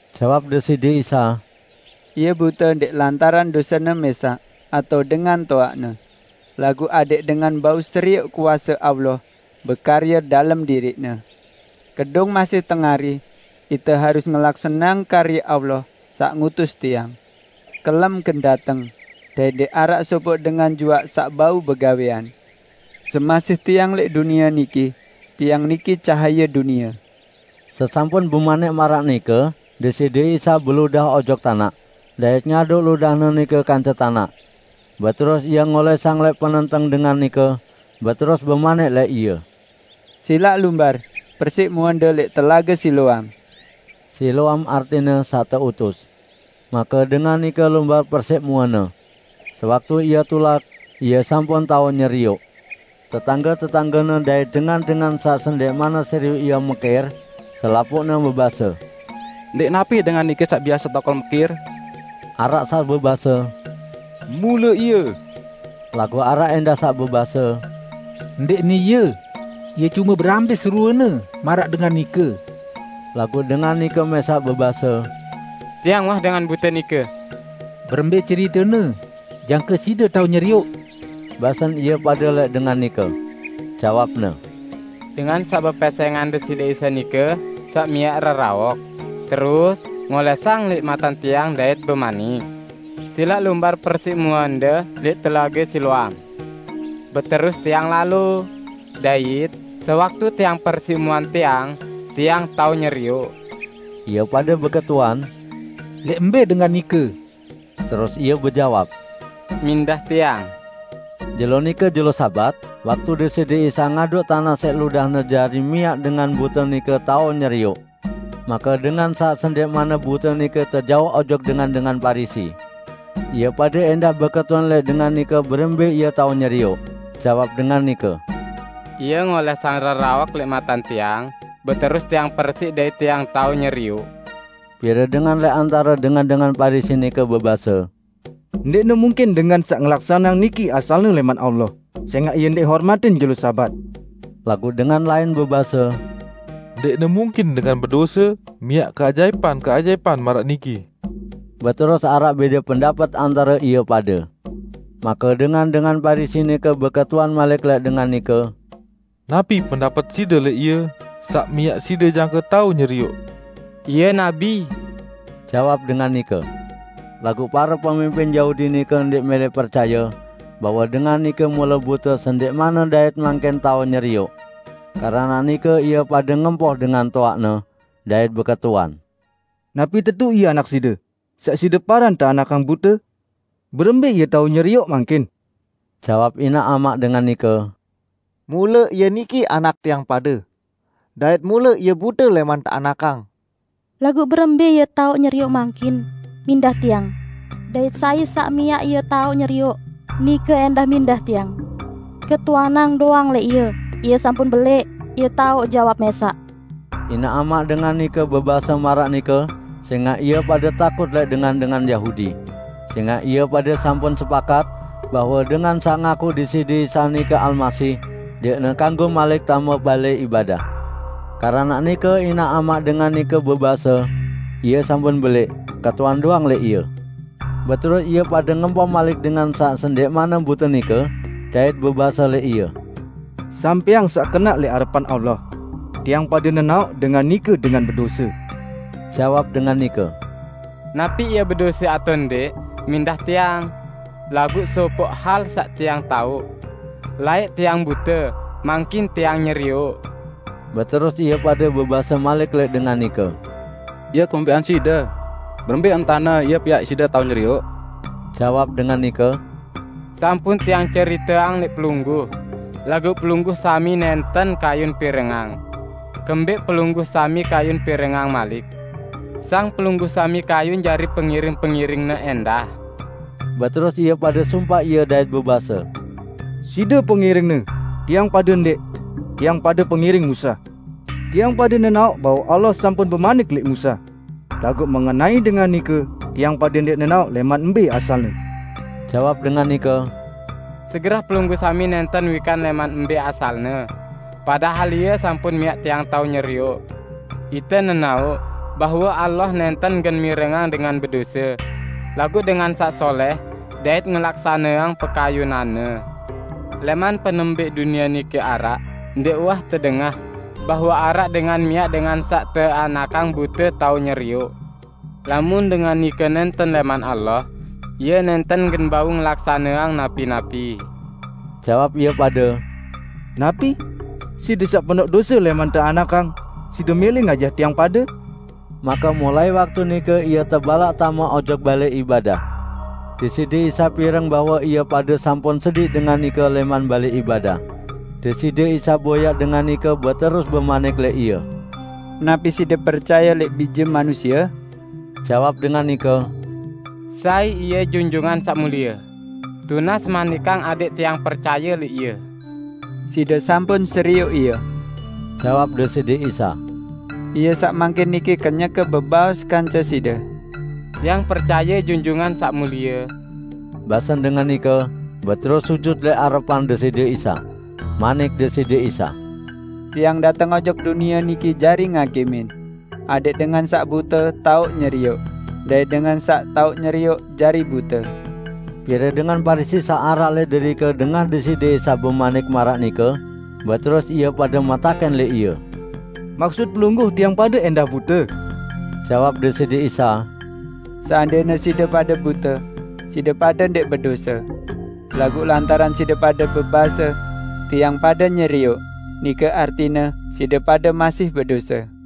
Jawab Deside Isa, "Ie bute ndẽq lantaran dosene mẽsaq atao dengan toaqne, laguq adẽq dengan bau serioq kuase Allah bekarye dalem diriqne. Kedung masih tengari, ite harus ngelaksaneang karye Allah saq ngutus Tiang. Kelem gen dateng, dait ndẽq araq sopoq dengan juaq saq bau begawẽan. Semasih Tiang lẽq dunie niki, Tiang niki cahaye dunie." Sesampun bemanik maraq nike Deside Isa beludah ojok tanaq, dait ngaduk ludah-Ne nike kance tanaq. Beterus Ie ngolẽsang lẽq penenteng dengan nike, beterus bemanik lẽq ie, "Silaq lumbar persiq muende lẽq Telage Siloam." (Siloam artine 'Saq Teutus'.) Make dengan nike lumbar persiq muene. Sewaktu ie tulak, ie sampun tao nyerioq. Tetangge-tetanggene dait dengan-dengan saq sendẽqmanne serioq ie mekir, selapuqne bebase, "Ndẽq napi dengan niki saq biase tokol mekir?" Araq saq bebase, "Mule ie." Laguq araq ẽndah saq bebase, "Ndẽqne ie, ie cume berambis ruene maraq dengan nike." Laguq dengan nike mẽsaq bebase, "Tiang uwah dengan bute nike." "Berembẽ ceritene jangke side tao nyerioq?" basen ie pade lẽq dengan nike. Jawabne, "Dengan saq bepesẽngan Deside Isa nike saq miaq reraok, terus ngolẽsang lẽq maten tiang dait bemanik, 'Silaq lumbar persiq muende lẽq Telage Siloam.' Beterus tiang lalo. Dait sewaktu tiang persiq muen tiang, tiang tao nyerioq." Ie pade beketuan, "Lẽq mbẽ dengan nike?" Terus ie bejawab, "Mindah tiang." Jelo nike jelo Sabat waktu Deside Isa ngaduk tanaq siq ludah-Ne jari miaq dengan bute nike tao nyerioq. Make dengan saq sendẽqmanne bute nike tejauq ojok dengan-dengan Parisi. Ie pade ẽndah beketuan lẽq dengan nike berembẽ ie tao nyerioq. Jawab dengan nike, "Ie ngolẽsang reraok lẽq maten tiang, beterus tiang persiq dait tiang tao nyerioq." Pire dengan lẽq antare dengan-dengan Parisi nike bebase, "Ndẽqne mungkin dengan saq ngelaksaneang niki asalne lẽman Allah, sẽngaq Ie ndẽq hormatin jelo Sabat." Laguq dengan lain bebase, "Ndẽqne mungkin dengan bedose miaq keajaipan-keajaipan maraq niki?" Beterus araq bẽde pendapet antare ie pade. Make dengan-dengan Parisi nike beketuan malik lẽq dengan nike, "Napi pendapet side lẽq Ie saq miaq side jangke tao nyerioq?" "Ie nabi," jawab dengan nike. Laguq pare pemimpin Yahudi nike ndẽq mẽlẽ percaye bahwe dengan nike mule bute sendẽqmanne dait mangkin tao nyerioq. Keranaq nike ie pade ngempoh dengan toaqne, dait beketuan, "Napi tetu ie anak side, saq side paran teanakang bute? Berembẽ ie tao nyerioq mangkin?" Jawab inaq amaq dengan nike, "Mule ie niki anak tiang pade; dait mule ie bute lẽman teanakang. Laguq berembẽ ie tao nyerioq mangkin, mindah tiang. Dait sai saq miaq ie tao nyerioq, nike ẽndah mindah tiang. Ketuanang doang lẽq ie, ie sampun belẽq; ie tao jawab mẽsaq." Inaq amaq dengan nike bebase maraq nike sẽngaq ie pade takut lẽq dengan-dengan Yahudi; sẽngaq ie pade sampun sepakat, bahwe dengan saq ngakuq Deside Isa nike Almasih, ndẽqne kanggo malik tame balẽ ibadah. Keranaq nike inaq amaq dengan nike bebase, "Ie sampun belẽq; ketuan doang lẽq ie." Beterus ie pade ngempoh malik dengan saq sendẽqmanne bute nike, dait bebase lẽq ie, "Sampẽang saq kenaq lẽq arepan Allah! Tiang pade nenaoq dengan nike dengan bedose." Jawab dengan nike, "Napi Ie bedose atao ndẽq, mindah tiang. Laguq sopoq hal saq tiang taoq; laẽq tiang bute, mangkin tiang nyerioq." Beterus ie pade bebase malik lẽq dengan nike, "Ie kumbẽqang side? Berembẽ entane Ie piaq side tao nyerioq." Jawab dengan nike, "Sampun tiang ceriteang lẽq pelungguh, laguq pelungguh sami nẽnten kayun pirengang. Kembẽq pelungguh sami kayun pirengang malik? Sang pelungguh sami kayun jari pengiring-pengiring-Ne ẽndah?" Beterus ie pade sumpaq ie dait bebase, "Side pengiring-Ne; tiang pade ndẽq! Tiang pade pengiring Musa. Tiang pade nenaoq bahwe Allah sampun bemanik lẽq Musa. Laguq mengenai dengan nike, tiang pade ndẽq nenaoq lẽman mbẽ asal-Ne." Jawab dengan nike, "Segerah pelungguh sami nẽnten wikan lẽman mbẽ asal-Ne, padahal Ie sampun miaq tiang tao nyerioq. Ite nenaoq bahwe Allah nẽnten gen mirengang dengan bedose, laguq dengan saq solẽh dait ngelaksaneang pekayunan-Ne. Lẽman penembẽq dunie niki araq, ndẽq uwah tedengah bahwe araq dengan miaq dengan saq teanakang bute tao nyerioq. Lamun dengan nike nẽnten lẽman Allah, Ie nẽnten gen bau ngelaksaneang napi-napi." Jawab ie pade, "Napi? Side saq penoq dose lẽman teanakang, side mẽlẽ ngajah tiang pade?" Make mulai waktu nike ie tebalaq tame ojok balẽ ibadah. Deside Isa pireng bahwe ie pade sampun sediq dengan nike lẽman balẽ ibadah. Deside Isa boyaq dengan nike beterus bemanik lẽq ie, "Napi side percaye lẽq Bije Manusie?" Jawab dengan nike, "Sai Ie, Junjungan Saq Mulie? Tunas manikang adẽq tiang percaye lẽq Ie." "Side sampun serioq Ie," jawab Deside Isa. "Ie saq mangkin niki kenyeke bebaos kance side." "Tiang percaye, Junjungan Saq Mulie," basen dengan nike, beterus sujut lẽq arepan Deside Isa. Manik Deside Isa, "Tiang dateng ojok dunie niki jari ngakimin; adẽq dengan saq bute tao nyerioq, dait dengan saq tao nyerioq, jari bute." Pire dengan Parisi saq araq lẽq derike dengah Deside Isa bemanik maraq nike, beterus ie pade metakẽn lẽq Ie, "Maksut Pelungguh tiang pade ẽndah bute?" Jawab Deside Isa, "Seandẽne side pade bute, side pade ndẽq bedose. Laguq lantaran side pade bebase, 'Tiang pade nyerioq,' nike artine side pade masih bedose."